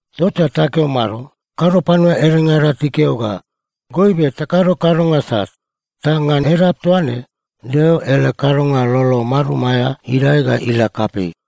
Tota takeo mado? Kado panua edengada tikeo ga, “Goibe takado kadonga sat, ta ngan edap toa ne Deo ele kadonga lolo marum aea idae ga ila kapei.”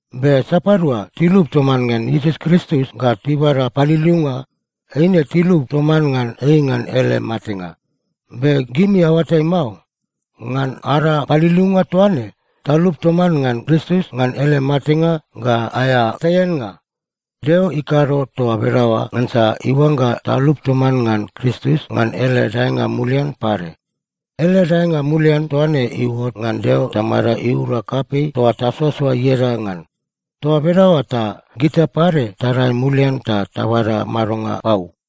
Be sapadua tilup toman ngan Iesus Kristus ga tibada paliliunga, eine tilup toman ngan ei ngan ele matenga. Be gimi aoatai mao? Ngan ada paliliunga toa ne, talup toman ngan Kristus ngan ele matenga ga aea taiannga. Deo ikado toa bedaoa ngansa iuangga talup toman ngan Kristus ngan ele daenga mulian pade. Ele daenga mulian toa ne iuot ngan Deo Tamada iura kapei toa tasoasoa ieda ngan. Toa bedaoa ta gita pade tadae mulian ta tabada madonga pau.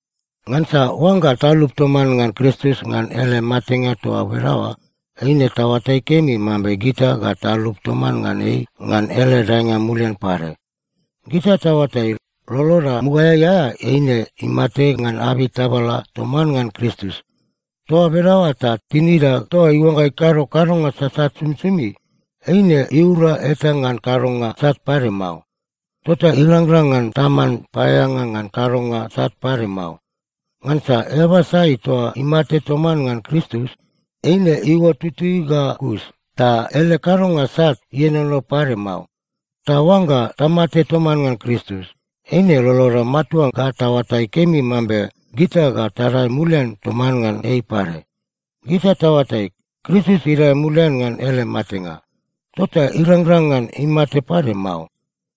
Ngansa oangga talup toman ngan Kristus ngan ele matenga toa bedaoa, eine taoatai kemi mambe gita ga talup toman ngan ei ngan ele daenga mulian pade. Gita taoatai, loloda mugaeai aea eine imate ngan abei tabala toman ngan Kristus. Toa bedaoa ta tinida toa iuangga ikado kadonga sasat somisomi, eine iura eta ngan kadonga sat pade mao. Tota irangrang ngan taman paeaeanga ngan kadonga sat pade mao. Ngansa eaba sai toa imate toman ngan Kristus, eine iuot tutui ga kus, ta ele kadonga sat ienono pade mao. Ta oangga tamate toman ngan Kristus, eine loloda matua ga taoatai kemi mambe gita ga tadae mulian toman ngan ei pade. Gita taoatai, Kristus idae mulian ngan ele matenga, tota irangrang ngan imate pade mao.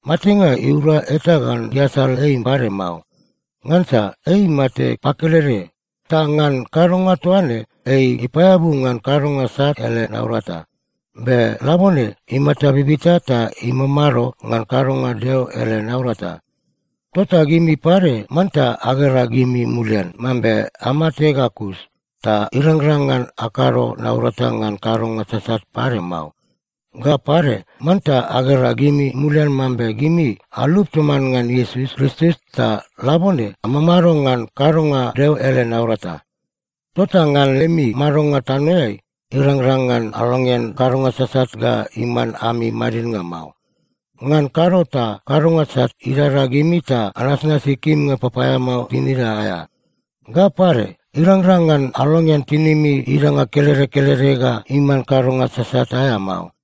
Matenga iura eta ngan iasal ei pade mao. Ngansa ei imate pakelede. Ta ngan kadonga toa ne, ei ipaeabu ngan kadonga sat ele naurata. Be labone imata bibita ta imamado ngan kadonga Deo ele naurata. Tota gimi pade manta agera gimi mulian mambe amate ga kus, ta irangrang ngan akado naurata ngan kadonga sasat pade mao. Ga pade, manta agera gimi mulian mambe gimi alup toman ngan Iesus Kristus ta labone amamado ngan kadonga Deo ele naurata. Tota ngan lemi madonga tanoeai, irangrang ngan alongean kadonga sasat ga iman ami madidnga mao. Ngan kado ta kadonga sat idada gimi ta anasnasi kimnga papaeamao tinida aea. Ga pade, irangrang ngan alongean tinimi idanga kelede kelede ga iman kadonga sasat aea mao.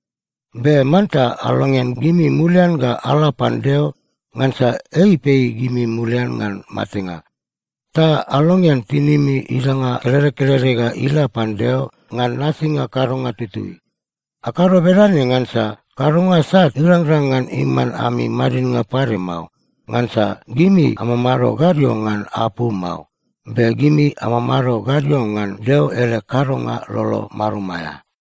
Be manta alongean gimi mulian ga ala pan Deo, ngansa ei ipei gimi mulian ngan matenga. Ta alongean tinimi idanga kelede kelede ga ila pan Deo ngan nasinga kadonga tutui. Akado bedane ngansa kadonga sat irangrang ngan iman ami madidnga pade mao. Ngansa gimi amamado gadio ngan apu mao, be gimi amamado gadio ngan Deo ele kadonga lolo marum aea.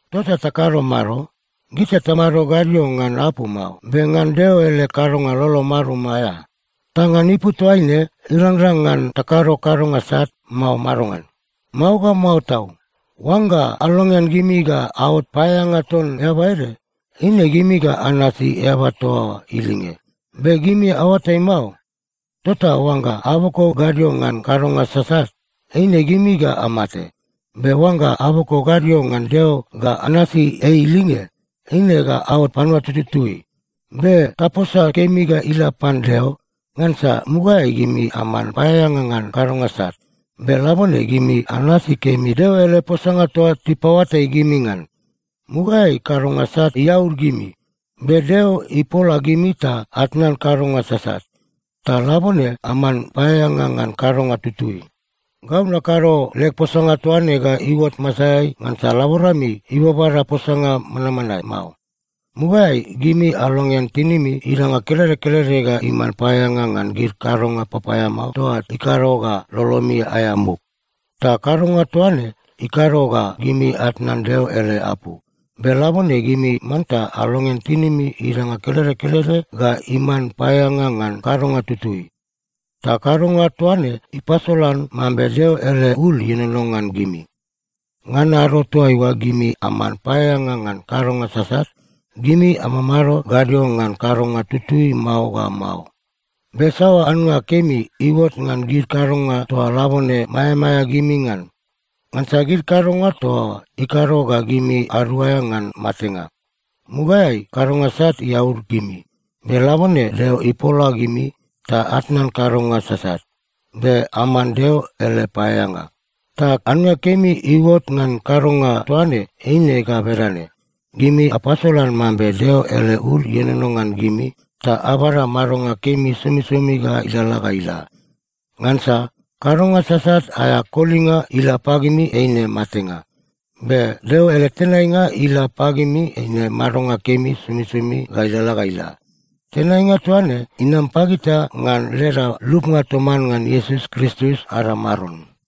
Tota takado mado? Gita tamado gadio ngan apu mao, be ngan Deo ele kadonga lolo marum aea. Ta ngan ipu toaine irangrang ngan takado kadonga sat, mao madongan? Mao ga mao tau! Oangga alongean gimi ga aot paeaeanga ton eaba ede, eine gimi ga anasi eaba toa oa ilinge. Be gimi aoatai mao? Tota oangga aboko gadio ngan kadonga sasat, eine gimi ga amate. Be oangga aboko gadio ngan Deo ga anasi ei ilinge, eine ga aot panua tututui. Be taposa kemi ga ila pan Deo, ngansa mugaeai gimi aman paeaeanga ngan kadonga sat, be labone gimi anasi kemi Deo ele posanga toa tipaoatai gimi ngan. Mugaeai kadonga sat iaud gimi, be Deo ipola gimi ta atnan kadonga sasat, ta labone aman paeaeanga ngan kadonga tutui. Gau nakado leg posanga toa ne ga iuot masaeai ngansa laborami ibabada posanga manmanae mao. Mugaeai gimi alongean tinimi idanga kelede kelede ga iman paeaeanga ngan gid kadonga papaeamao toa ikado ga lolomi aea muk. Ta kadonga toa ne ikado ga gimi atnan Deo ele apu. Be labone gimi manta alongean tinimi idanga kelede kelede ga iman paeaeanga ngan kadonga tutui. Ta kadonga toa ne ipasolan mambe Deo ele ul ienono ngan gimi. Ngan ado toaiua gimi aman paeaeanga ngan kadonga sasat, gimi amamado gadio ngan kadonga tutui mao ga mao. Be saoa annga kemi iuot ngan gid kadonga toa labone maeamaea gimi ngan? Ngansa gid kadonga toa oa ikado ga gimi aduaea ngan matenga. Mugaeai kadonga sat iaud gimi, be labone Deo ipola gimi ta atnan kadonga sasat, be aman Deo ele paeaeanga. Ta annga kemi iuot ngan kadonga toa ne eine ga bedane: Gimi apasolan mambe Deo ele ul ienono ngan gimi ta abada madonga kemi somisomi ga ilalala ga ila. Ngansa kadonga sasat aea kolinga ila pagimi eine matenga. Be Deo ele tenainga ila pagimi eine madonga kemi somisomi ga ilalala ga ila. Tenainga toa ne inam pagita ngan leda lupnga toman ngan Iesus Kristus ada Maron.